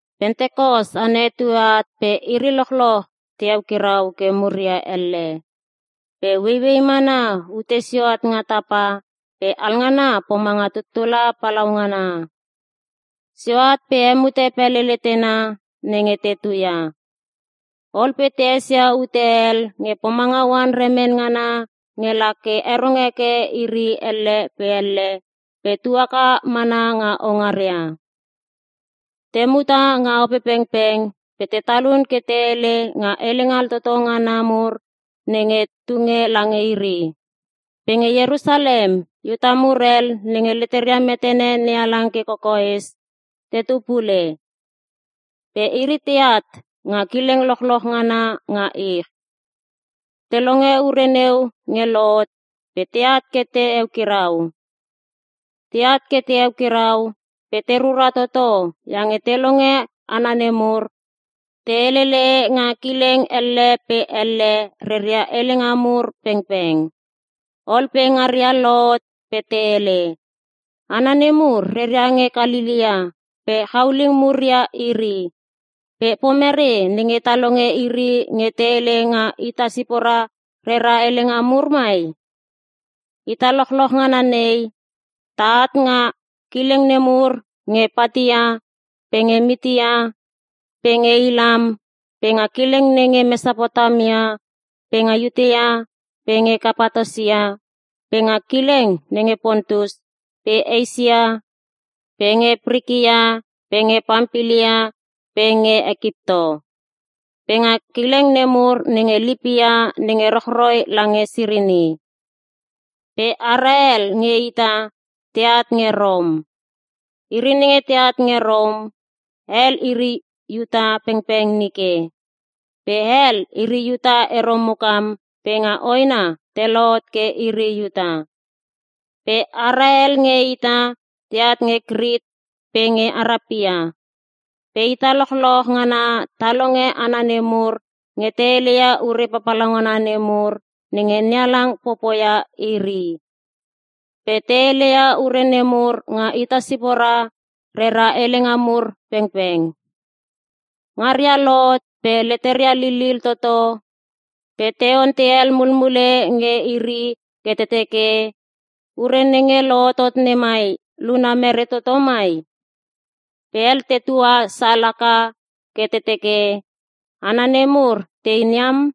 Pentekos ana etue at pe iri lochloch te eukirau ke muria elle. Pe ueiuei mana ute sio at nga tapa pe alngana pomanga tuttula palaungana. Sio at pe hemute pele letena nenge te tuia. Ol pe te esia ute hel nge pomanga oan remen ngana nge la ke rongo heke iri elle pe elle pe tu haka mana nga houngaria. Te muta nga Opepengpeng pe te talun ke te hele nga helenga altoto ngana mur nenge tunge lange iri. Pe nge Ierusalem, Iuta mur hel nenge leteria metene NeHalang ke kokoes, te tu pule. Pe iri teat nga kileng lochloch ngana nga ich. Te longe ure neu nge lohot pe teat ke te eukirau. Teat ke te eukirau pe te rura toto iange te longe hana nemur nge te helele nga kileng elle pe elle reria helenga mur pengpeng. Ol pe ngaria lohot pe te hele, “Hana nemur reria nge Kalelea pe chauling mur ia iri. Pe pomere nenge ta longe iri nge te hele nga ita sipora rera helenga mur mai? Ita lochloch ngana nei ta at nga kileng nemur nge Patia pe nge Mitia, pe nge Ilam pe nga kileng nenge Mesapotamia pe nge Iuta pe nge Kapatosia pe nga kileng nenge Pontus pe Eisia pe nge Prikia pe nge Pampilia pe nge Ekipto. Pe nga kileng nemur nenge Lipia nenge rochroi lange Sirini. Pe ara hel nge ita teat nge Rom. ( Iri nenge teat nge Rom, hel iri Iuta pengpeng nike. Pe hel, iri Iuta ero mukam pe nga hoena te lohot ke iri Iuta.) Pe ara hel nge ita teat nge Krit pe nge Arapia. Pe ita lochloch ngana ta longe hana nemur nge te heleia ure papalaungana nemur nenge NeHalang popoia iri. Pe te heleia ure nemur nga ita sipora rera helenga mur pengpeng.” Ngaria lohot pe leteria lilil toto pe te ontei hel mulmule nge iri ke te teke, “Ure nenge lohotot nemai, luna mere toto mai?” Pe hel tetua sal haka ke te teke, “Hana nemur tein iam.”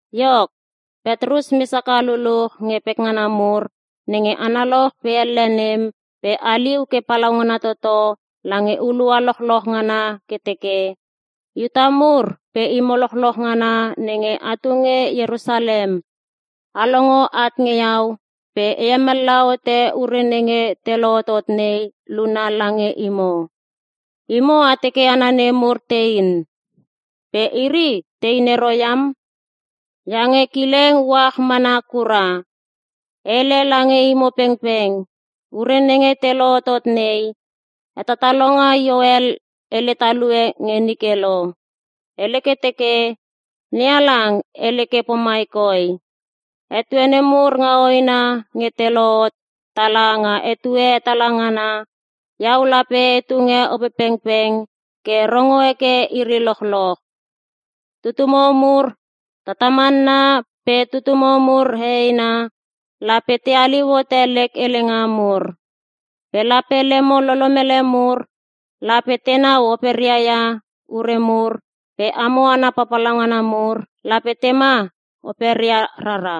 Iok, Petrus mes haka luluch nge pekngana mur nenge analoch pe elle nem pe haliu ke palaungana toto lange hulua lochloch ngana ke teke, “Iuta mur pe imo lochloch ngana nenge atu nge Ierusalem, a longo at nge iau pe e hemallaha hote ure nenge te lohotot nei luna lange imo. Imo a teke hana nemur tein. Pe iri tein ero iam, iange kileng uach mana kura! E hele lange imo pengpeng, ure nenge te lohotot nei, hetatalonga Ioel hele talue nge nike lo. Hele ke teke, “‘NeHalang hele ke pomai koi; Etue nemur nga hoena nge te lohot tala nga etue hetala ngana, iau lape e tunge Opepengpeng ke rongo heke iri lochloch. Tutumo mur tatamanna pe tutumo mur heheina, lape te haliu hote lek helenga mur. Pe lape lemo lolomele mur, lape tenau operia ia ure mur pe amo hana papalauna mur, lape tema operia rara.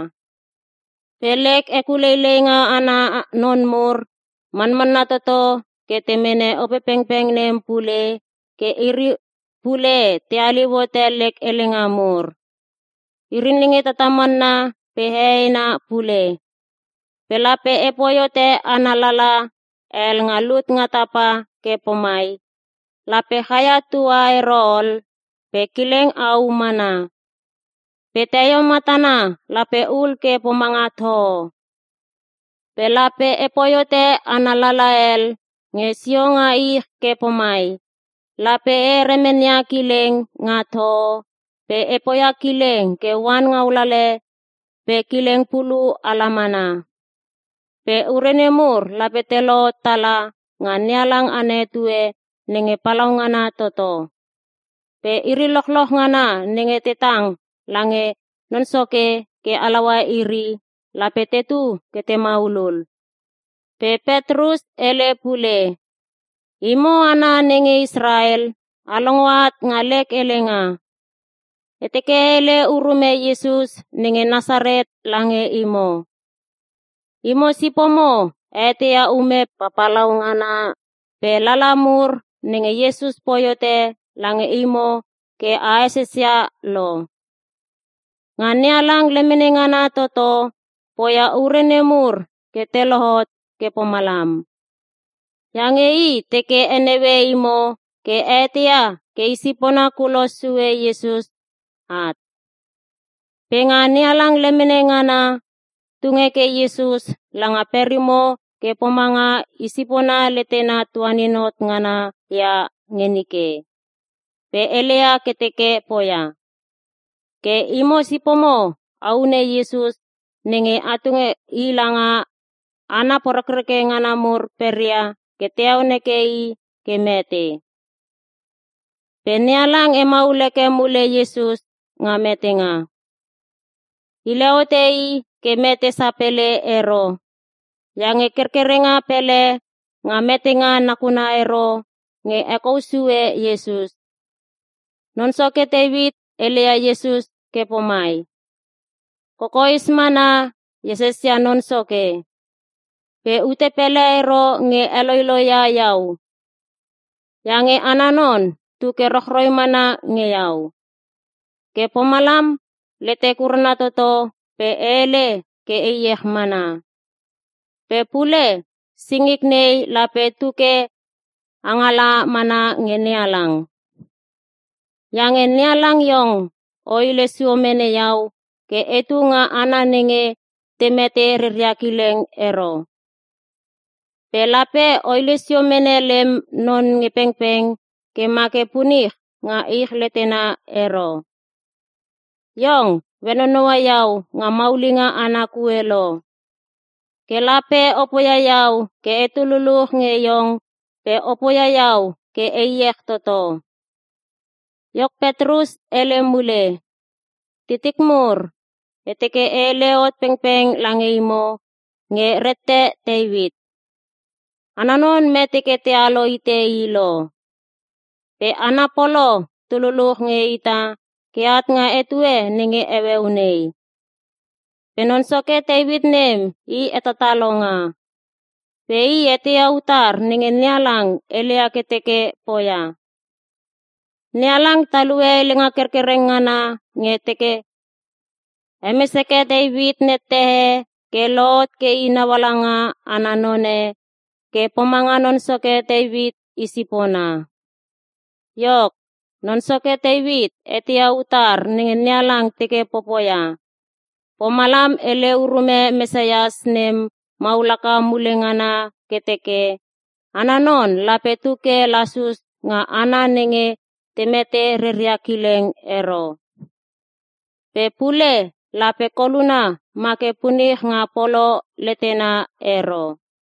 Pe lek hekuleileinga ana non mur, manmanna toto ke te mene Opepengpeng nem pule, ke iri pule te haliu hote lek helenga mur. Iri nenge tatamanna pe heheina pule. Pe lape epoi hote ana lala hel nga lut nga tapa ke pomai, lape chaia tua ero ol, pe kileng au mana. Pe teio matana lape hul ke pomanga toho. Pe lape epoi hote ana lala hel nge sio nga ich ke pomai, lape e heremenia kileng nga toho pe e poia kileng ke oan ngaulele pe kileng pulu ala mana. Pe ure nemur lape te lohot tala nga NeHalang ana etue nenge palaungana toto. Pe iri lochloch ngana nenge te tang la nge Non Soke ke halaua iri, lape tetu ke te maulul.’” Pe Petrus hele pule, “Imo hana nenge Israel, a longo at nga lek helenga. E teke e hele urume Iesus nenge Nasaret lange imo. Imo sipomo a eteia ume papalaungana pe lala mur nenge Iesus poi hote lange imo ke a esesia lo. Nga NeHalang lemene ngana toto, poia ure nemur ke te lohot ke pomalam. Iange i teke heneue imo ke a eteia ke i sipona kulos sue Iesus at. Pe nga NeHalang lemene ngana, tung heke Iesus langa perimo ke pomanga i sipona letena tuanin hot ngana ia nge nike, pe heleia ke teke poia. Ke imo sipomo a hune Iesus nenge a tunge i langa hana poreke ngana mur peria ke te heon heke i ke mete. Pe NeHalang hemaul heke mule Iesus nga metenga. Hile hote i ke mete sapele ero, iange kerkerenga pele nga metenga nakuna ero nge hekou sue Iesus. Non Soke Teuit heleia Iesus ke pomai, “‘Kokoes mana e esesia Non Soke. Pe ute pele ero nge heloiloi ia iau. Iange ana non tu ke rochroi mana nge iau. Ke pomalam letek urana toto pe e hele ke e iech mana. Pe pule singik nei lape tuke angala mana nge NeHalang. Iange NeHalang iong, o hile sio mene iau ke etu nga hana nenge te mete reria kileng ero. Pe lape o hile sio mene lem non nge pengpeng ke ma ke punich nga ich letena ero. Iong, o henonoua iau nga maulinga ana kue lo. Ke lape o poia iau ke etu luluch nge iong pe o poia iau ke e iech toto.’” Iok Petrus hele mule, “Titik mur e teke e hele hot pengpeng lange imo nge rette Teuit. Ana non mete ke tealo hite i lo. Pe ana polo tu luluch nge ita ke at nga etue nenge heueu nei. Pe non soke Teuit nem i hetatalonga. Pe i eteia utar nenge NeHalang heleia ke teke poia. NeHalang talue helenga kerkereng ngana nge teke hemes heke Teuit nette e ke lohot ke i naungaala ana none, ke pomange Non Soke Teuit i sipona. Iok, Non Soke Teuit eteia utar nenge NeHalang teke popoia, pomalam hele urume Mesias nem maul haka mule ngana ke teke, ana non lape tu ke lasus nga hana nenge te mete reria kileng ero. Pe pule lape koluna ma ke punich nga polo letena ero.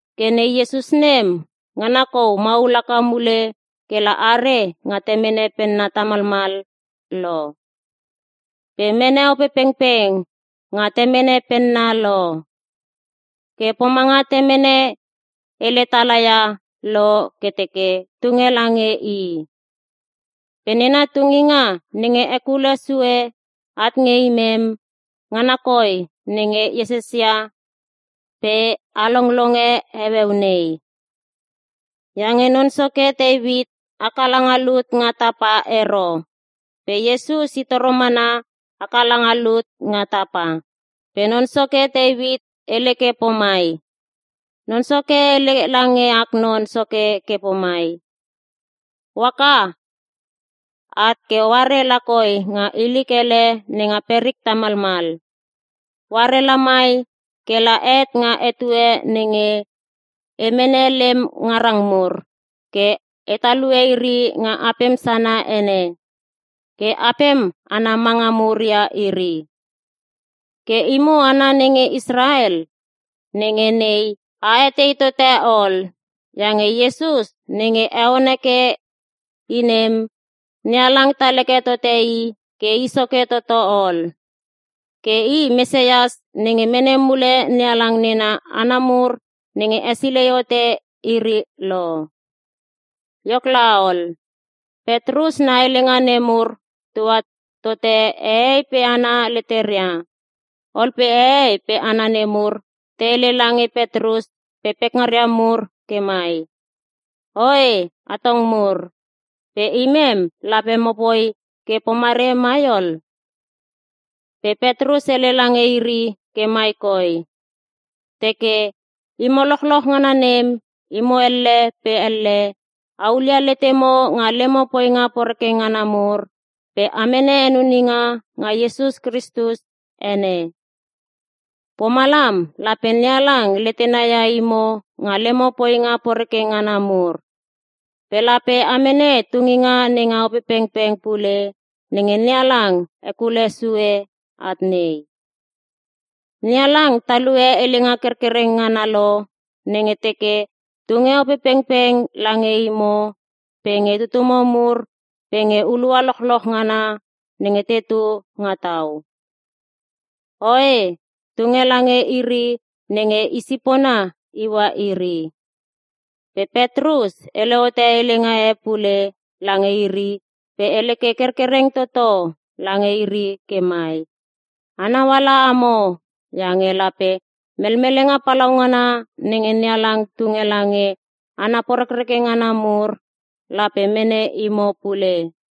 Ke Ne Iesus nem, ngana kou maul haka mule kela are nga Temene penna tamalmal lo. Pe mene Opepengpeng nga Temene penna lo. Ke pomanga Temene hele talaia lo ke teke tunge lange i. Pe nena tunginga nenge hekulo sue at nge imem, ngana koi nenge a esesia pe a longlonge heueu nei. “Iange Non Soke Teuit haka langa lut nga tapa ero. Pe Iesus i toro mana haka langa lut nga tapa. Pe Non Soke Teuit hele ke pomai, “‘Non Soke hele lange ak Non Soke ke pomai: “O haka at ke oare lakoi nga ilik ele nenga perik tamalmal. Oare lamai kela het nga etue nenge, e mene lem ngarang mur, ke e talue iri nga apem sana ene, ke apem ana manga mur ia iri.” ’ “Ke imo hana nenge Israel, nenge nei a etei tote ol, iange Iesus nenge a heon heke i nem, NeHalang tal heke tote i ke i soke toto ol. Ke i Mesias nenge mene mule NeHalang nena hana mur nenge hesilei hote iri lo.” Iok laol, Petrus na helenga nemur tua tote hehei pe hana leteria, ol pe hehei pe hana nemur te hele lange Petrus pe pekngana mur ke mai, “Oe atong mur, pe imem lape mopoi ke pomere mai ol?” Pe Petrus hele lange iri ke mai koi, teke, “Imo lochloch ngana nem, imo elle pe elle, a hulia letemo nga lemo poinga poreke ngana mur, pe a mene henuninga nga Iesus Krisus ene. Pomalam lape NeHalang letena ia imo nga lemo poinga poreke ngana mur. Pe lape a mene tunginga nenga Opepengpeng pule nenge NeHalang hekulo sue at nei. NeHalang talue helenga kerkereng ngana lo, nenge teke tunge Opepengpeng lange imo pe nge tutumo mur pe nge hulua lochloch ngana nenge tetu nga tau. Oe, tunge lange iri nenge i sipona iua iri.” Pe Petrus hele hote helenga e pule lange iri pe hele ke kerkereng toto lange iri ke mai, “Anau ala amo, iange lape melmelenga palaungana nenge NeHalang tunge lange hana poreke ngana mur, lape mene imo pule!”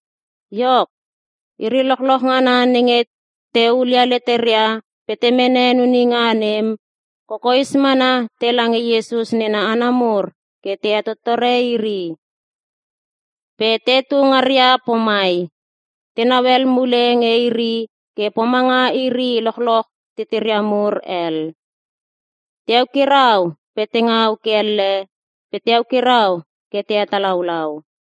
Iok, iri lochloch ngana nenge te hulia leteria pe te mene henuninga nem, kokoes mana tela nge Iesus nena hana mur ke te hetottore iri. Pe tetu ngaria pomai, tenau hel mule nge iri ke pomanga iri lochloch titiria mur hel. Te eukirau pe te ngau ke elle pe te eukirau ke te hetalaulau.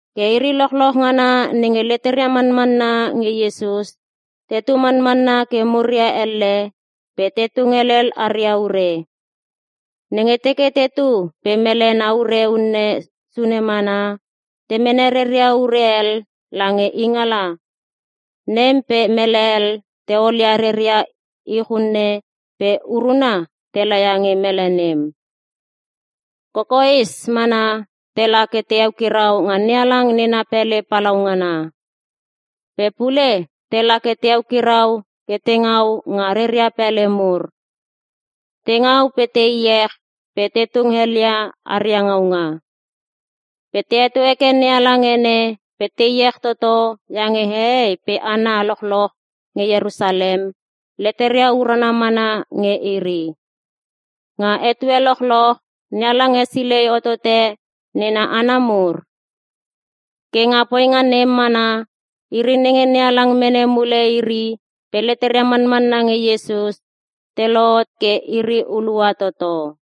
Ke iri lochloch ngana nenge leteria manmanna nge Iesus tetu manmana ke muria elle, pe te tung helel aria ure. Nenge teke tetu pe mele na ure unne sune mana, te mene reria ure hel langa ingala, nem pe mele hel te olia reria ich unne pe uruna te laia nge mele nem. Kokoes mana tela ke te eukirau nga NeHalang nena pele palaungana. Pe pule tela ke te eukirau ke te ngau nga reria pele mur. Te ngau pe te iech pe te tung helia aria ngaunga. Pe te heto heke NeHalang ene pe te iech toto iange hehei pe hana lochloch nenge Ierusalem, leteria urana mana nge iri. Nga etue lochloch, NeHalang hesilei hotote nena hana mur. Ke nga poinga nem mana, iri nenge NeHalang mene mule iri pe leteria manmanna nge Iesus, te lohot ke iri hulua toto.